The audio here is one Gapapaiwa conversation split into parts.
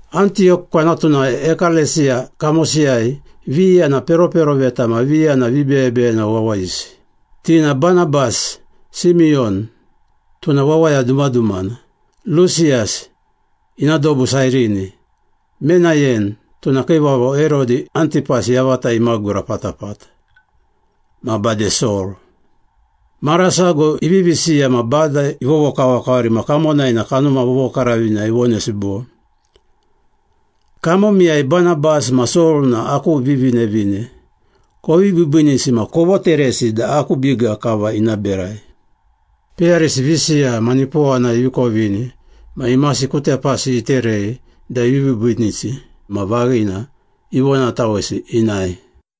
Antiyok kwanatunai ekalesiya kamosiyai, viya na peroperoveta ma viya na vibeyebeyena wawayisi. Ti na Banabas, Simiyon (tuna wawaya dumadumana), Lusiyas (ina dobu Sairini), Menayen (tuna kiivavo Herodi Antipas yavata imagura patapata) ma bade Sol. Mara sago ivivi siya ma Bada ivovokavakavari ma kamonai na Kanuma Vovokaravina ivonesi bo, “Kamomiyai Banabas ma Sol na aku vivinevine, kovi biibiinisi ma kovoteresi da aku biga kava ina berai.” Peyarisi visiya ma nipowana ivi kovini na imasi ku tepasi iterei da ivi biibiinisi ma vaghina, ivonatawesi inae.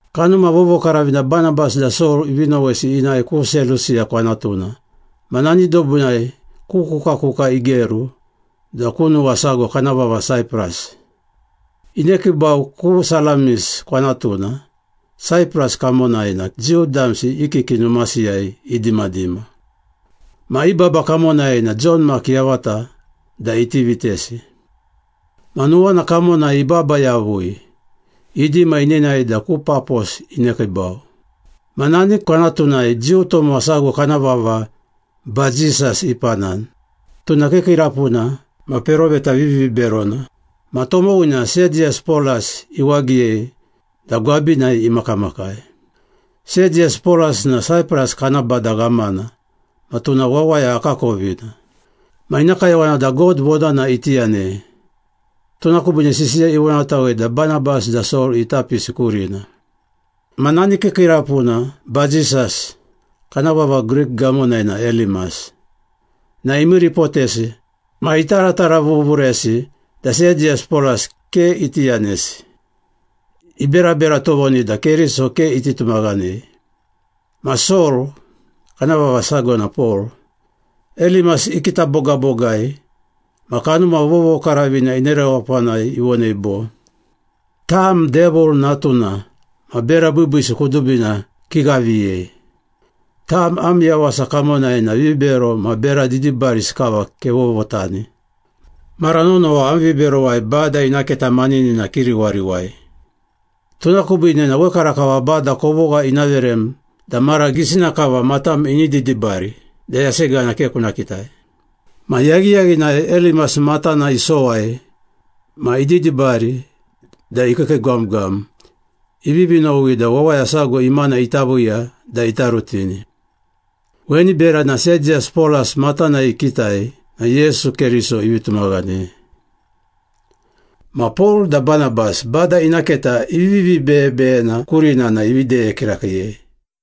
Kanuma Vovokaravina Banabas da Sol ivi nowesi inae ku Selusiya kwanatuna ma nani dobunai ku kukakuka igeru da ku nuwa sago kana vava Saipras. Inekiibau ku Salamis kwanatuna Saipras kamonai na Jiu damsi i kiki numasiyai idimadima. Ma i baba kamonai na Jon Mak yavata da iti vitesi. Ma nuwana kamonai ibaba yavui, idima inenae da ku Papos inekiibau. Ma nani kwanatunai Jiu tomowa sago kana vava Bajisas ipanani. Tuna kiikiirapuna ma peroveta viviberona ma tomowina Sediyas Polas iwagiyei da gwabinai imakamakai. Sediyas Polas na Saipras kana bada ghamana ma tuna wawaya akakovina. Ma ina kayowana da God vonana iti yanei, tuna kubiine sisiya ivonatawei da Banabas da Sol ita pisi kurina. Ma nani kiikiirapuna Bajisas (kana vava Grik gamonai na Elimas) na imiiripotesi ma itarataravuvuresi da Sediyas Polas ke iti yanesi, iberabera tovoni da Keriso ke iti tumaghanei. Ma Sol (kana vava sago na Pol) Elimas ikita bogabogai ma Kanuma Vovokaravina ina rewapanai ivonei bo, “Tam Devil natuna ma bera biibiisi kudubina kighaviyei. Tam am yawasa kamonai na vibero ma bera didibarisi kava kevovotani. Mara nonowa am viberowai Bada ina keta maninina kiriwariwai. Tuna kubiine na wekarakava Bada kovogha ina verem da mara gisina kava matam ini didibari da yasegana ke kuna kitai!” Ma yaghiyaghinai Elimas matana isowai ma ididibari da ikiikiigwamgwam, ivivi nowi da wawaya sago imana ita viiya da ita rutini. Weni berana Sediyas Polas matanai ikitai na Yesu Keriso ivi tumaghanei. Ma Pol da Banabas Bada ina keta ivivi beyebeyena kurina na ivi deye kirakiiyei.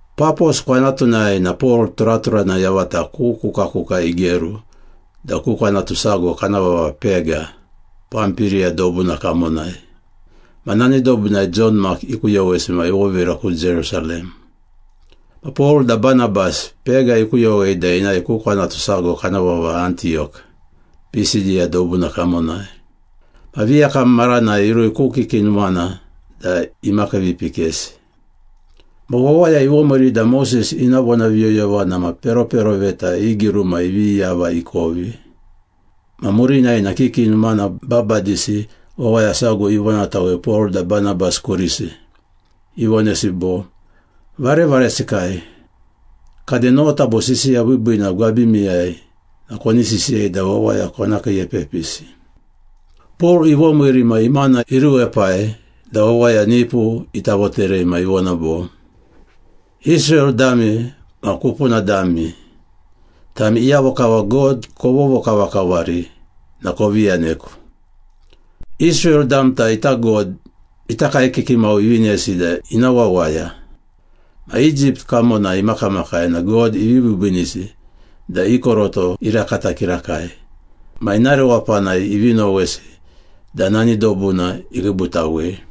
Papos kwanatunai na Pol turaturana yavata ku kukakuka igeru da ku kwanatu sago kana vava Pega, Pampiriya dobuna kamonai. Ma nani dobunai Jon Mak ikuyowesi ma ivovira ku Jerusalem. Ma Pol da Banabas, Pega ikuyowei da inae ku kwanatu sago kana vava Antiyok, Pisidiya dobuna kamonai. Ma viyakam maranai irui ku kiki numana da imakiivipikesi. Ma wawaya ivomiiri da Moses ina vonaviyoyovana ma peroperoveta i giruma ivi yava ikovi, ma murinai na kiki numana babadisi wawaya sago ivonatawei Pol da Banabas kurisi, ivonesi bo, “Varevaresikai, kade nota bo sisiya biibiina gwabimiyai na koni sisiyei da wawaya kona kiiepepisi.” Pol ivomiiri ma imana iruepai da wawaya nipu ita voterei ma ivona bo, “Israel dami ma kupuna dami, tami iyavo kava God kovovokavakavari na kovi yaneku. Israel damta ita God ita kaekiki mau ivinesi da ina wawaya. Ma Egypt kamonai imakamakai na God ivi biibiinisi da i koroto irakata kirakai, ma ina rewapanai ivi nowesi da nani dobuna ikiibutawei.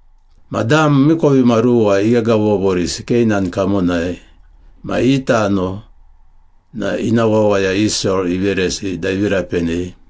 Ma dam miikovimaruwa ighegavovorisi Keinan kamonai ma i tano na ina wawaya Israel iveresi da ivi rapenei.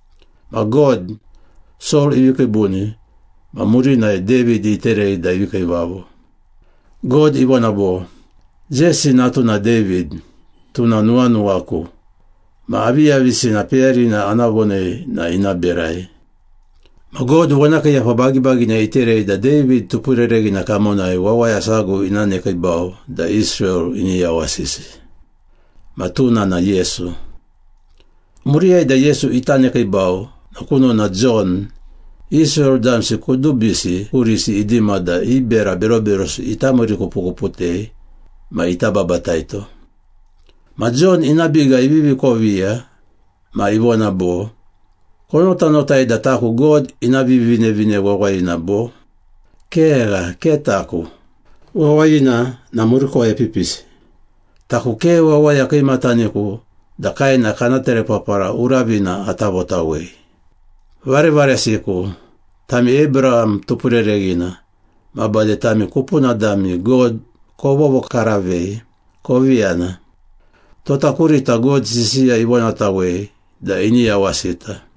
Ma God, Sol ivi kiibuni ma murinai David iterei da ivi kiivavo. God ivona bo, ‘Jesi natuna David, tuna nuwanuwaku ma aviyavisina peyarina ana vonei na ina berai.’ Ma God vonakiiyapa bagibagina iterei da David tupurereghina kamonai wawaya sago ina nekiibau da Israel ini yawasisi. Ma tuna na Yesu. Muriyai da Yesu ita nekiibau na kunona Jon, Israel damsi kudubisi kurisi idima da i bera beroberosi ita miirikupukuputei ma ita babataito. Ma Jon ina biga ivivi koviya ma ivona bo, ‘Konotanotai da taku God ina Vivinevine Wawayina bo? Kegha, ke taku. Wawayina na murikuwai epipisi. Taku ke wawaya kiimataniku da kaena kana terepapara uravina ata votawei.’” “Varevaresiku, tami Abraham tupurereghina ma bade tami kupuna dami God kovovokaravei, kovi yana. Tota kurita God sisiya ivonatawei da ini yawasita.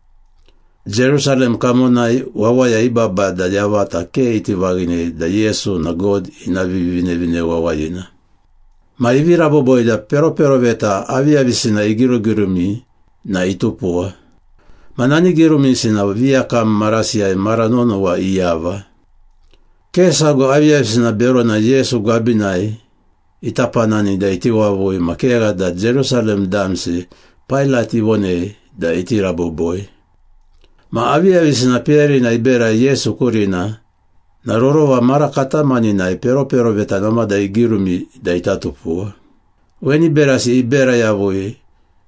Jerusalem kamonai wawaya i babada yavata ke iti vaghinei da Yesu na God ina Vivinevine Wawayina. Ma ivi raboboi da peroperoveta aviyavisina igirugirumi na itupuwa. Ma nani girumisi na viyakam marasiyai mara nonowa iyava. Ke sago aviyavisina berona Yesu gwabinai ita panani da iti wavui ma kegha da Jerusalem damsi Pailat ivonei da iti raboboi. Ma aviyavisina peyarina iberai Yesu kurina na rorova mara katamaninai peroperoveta namada igirumi da ita tupuwa. Weni berasi ibera yavui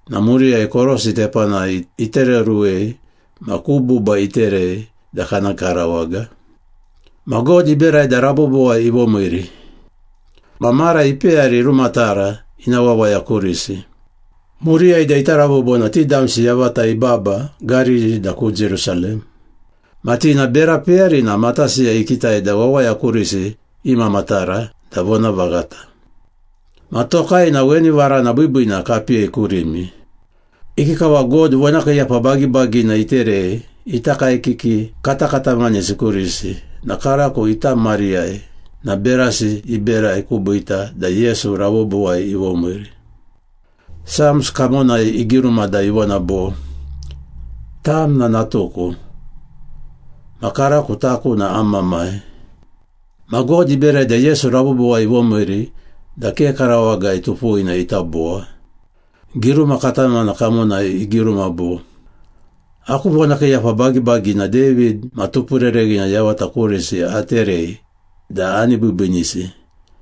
na muriyai korosi tepanai itereoruwei ma ku buba iterei da kana karawaga. Ma God iberai da rabobowai ivomiiri.” “Ma mara ipeyari irumatara ina wawaya kurisi. Muriyai da ita rabobo na ti damsi yavata ibaba Gariri da ku Jerusalem. Ma ti na bera peyarina matasiyai ikitai da wawaya kurisi imamatara da vonavaghata. Ma tokai na weni varana biibiina kapiyei kurimi. Ikikava God vonakiiyapa bagibagina iterei ita kaekiki katakatamanisi kurisi na karako ita mariyai na berasi iberai kubiita da Yesu rabobowai ivomiiri. Psalms kamonai igiruma da ivona bo, ‘Tam na natuku, Ma karako taku na am Mamai.’ Ma God iberai da Yesu rabobowai ivomiiri da ke karawagai tupuwina ita bowa. Giruma katamana kamonai igiruma bo, ‘Aku vonakiiyapa bagibagina David ma tupurereghina yavata kurisi aterei da ani biibiinisi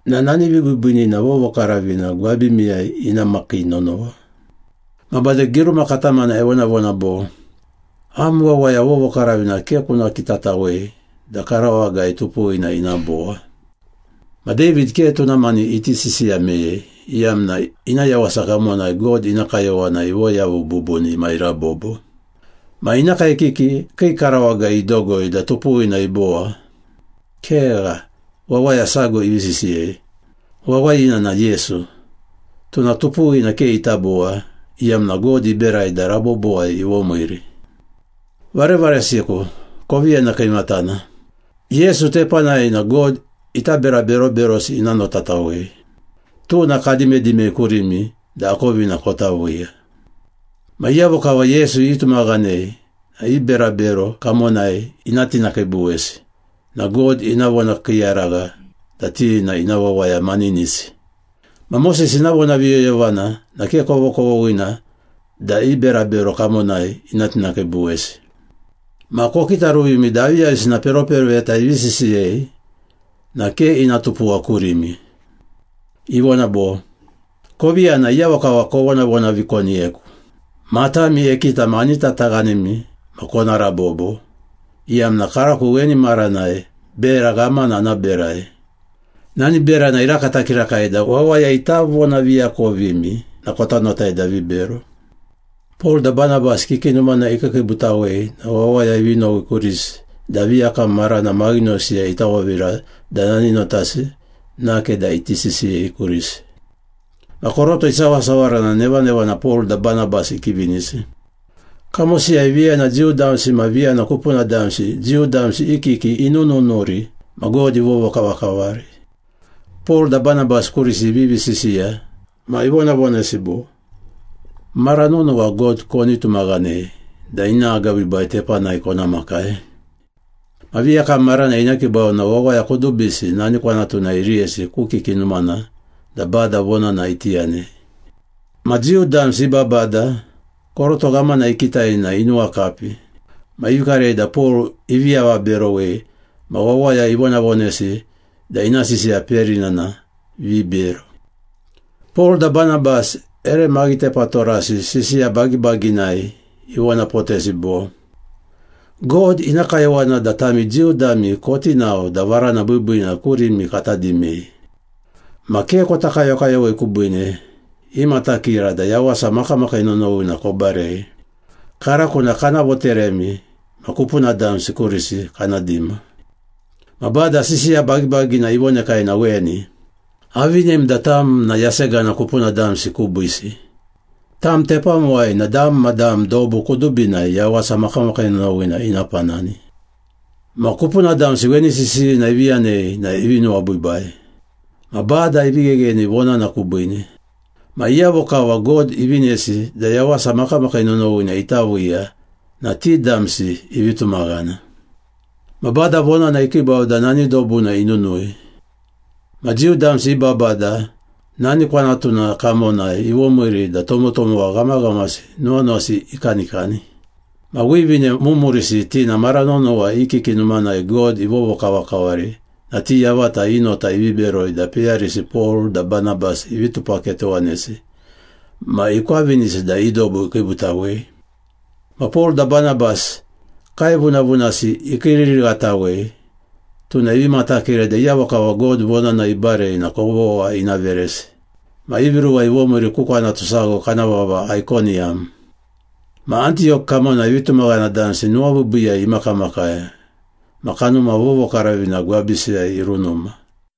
na nani vibiibiinina vovokaravina gwabimiyai ina makii nonowa.’ Ma bade giruma katamana evonavona bo, ‘Am wawaya vovokaravina ke kuna kitatawei da karawagai tupuwina ina bowa.’” “Ma David ke tuna mani iti sisiya meyei, iyamna ina yawasa kamonai God ina kayowana ivoyavu bubuni ma irabobo. Ma ina kaekiki kii karawagai idogoi da tupuwina ibowa. Kegha, wawaya sago ivi sisiyei. Wawayina na Yesu, tuna tupuwina ke ita bowa, iyamna God iberai da rabobowai ivomiiri. Varevaresiku, kovi yana kiimatana. Yesu tepanai na God ita bera beroberosi ina notatawei. Tuna kadimadimei kurimi da akovina kota viiya. Ma iyavo kava Yesu itumaghanei na i berabero kamonai ina tinakiibuwesi ma God ina vonakiiyaragha da ti na ina wawaya maninisi. Ma Moses ina vonaviyoyovana na ke kovokovoghina da i berabero kamonai ina tinakiibuwesi. Ma kokitaruvimi da aviyavisina peroperoveta ivivi sisiyei na ke ina tupuwa kurimi. Ivona bo, ‘Kovi yana, iyavo kava kovonavonavikoniyeku. Matami ekita ma ani tataghanimi ma kona rabobo, iyamna karako weni maranai bera ghamana ana berai. Nani berana irakata kirakai da wawaya ita vonaviakovimi na kota notai da vibero.’” Pol da Banabas kiki numana ikiikiibutawei na wawaya ivi nowi kurisi da viyakam marana maghinosiyai ita vovira da nani notasi nake da iti sisiyei kurisi. Ma koroto isawasawara na nevanevana Pol da Banabas ikivinisi. Kamosiyai viya na Jiu damsi ma viya na kupuna damsi Jiu damsi i kiki inununuri ma God ivovokavakavari. Pol da Banabas kurisi ivivi sisiya ma ivonavonesi bo, “Mara nonowa God koni tumaghanei da ina agabiibai tepanai kona makai.” Ma viyakam marana inekiibau na wawaya kudubisi nani kwanatunai iriyesi ku kiki numana da Bada vonana iti yanei. Ma Jiu damsi i babada koroto ghamana ikitai na inuwakapi. Ma ivi karei da Pol ivi avaberowei ma wawaya ivonavonesi da ina sisiya peyarina na vibero. Pol da Banabas ere maghitepatorasi sisiya bagibaginai ivonapotesi bo, “God ina kayowana da tami Jiu dami koti nao da varana biibiina kurimi kata dimei. Ma ke kota kayokayowei kubiine, imatakira da yawasa makamakii nonowina kobarei. Karako na kana voteremi ma kupuna damsi kurisi kana dima. Ma Bada sisiya bagibagina ivonekai na weni, ‘Avinem da tam na yasegana kupuna damsi kubiisi, tam tepamuwai na dam ma dam dobu kudubinai yawasa makamakii nonowina ina panani.’” Ma kupuna damsi weni sisiyina ivi yanei na ivi nuwabiibai. Ma Bada ivi ghegheni vonana kubiine. Ma iyavo kava God ivinesi da yawasa makamakii nonowina ita viiya na ti damsi ivi tumaghana. Ma Bada vonana ikiibau da nani dobuna inunui. Ma Jiu damsi i babada nani kwanatuna kamonai ivomiiri da tomotomowa ghamaghamasi nuwanuwasi ikanikani. Ma wivine mumurisi ti na mara nonowa i kiki numanai God ivovokavakavari na ti yavata i nota ivi beroi da peyarisi Pol da Banabas ivi tupaketowanesi ma ikwavinisi da i dobu ikiibutawei. Ma Pol da Banabas kaevunavunasi ikiiririghatawei, tuna ivi matakira da iyavo kava God vonana ibarei na kovogha ina veresi. Ma ivi ruwa ivomiiri ku kwanatu sago kana vava Aikoniyam. Ma Antiyok kamonai vitumaghana damsi nuwabiibiiyai imakamakai ma Kanuma Vovokaravina gwabisiyai irunuma.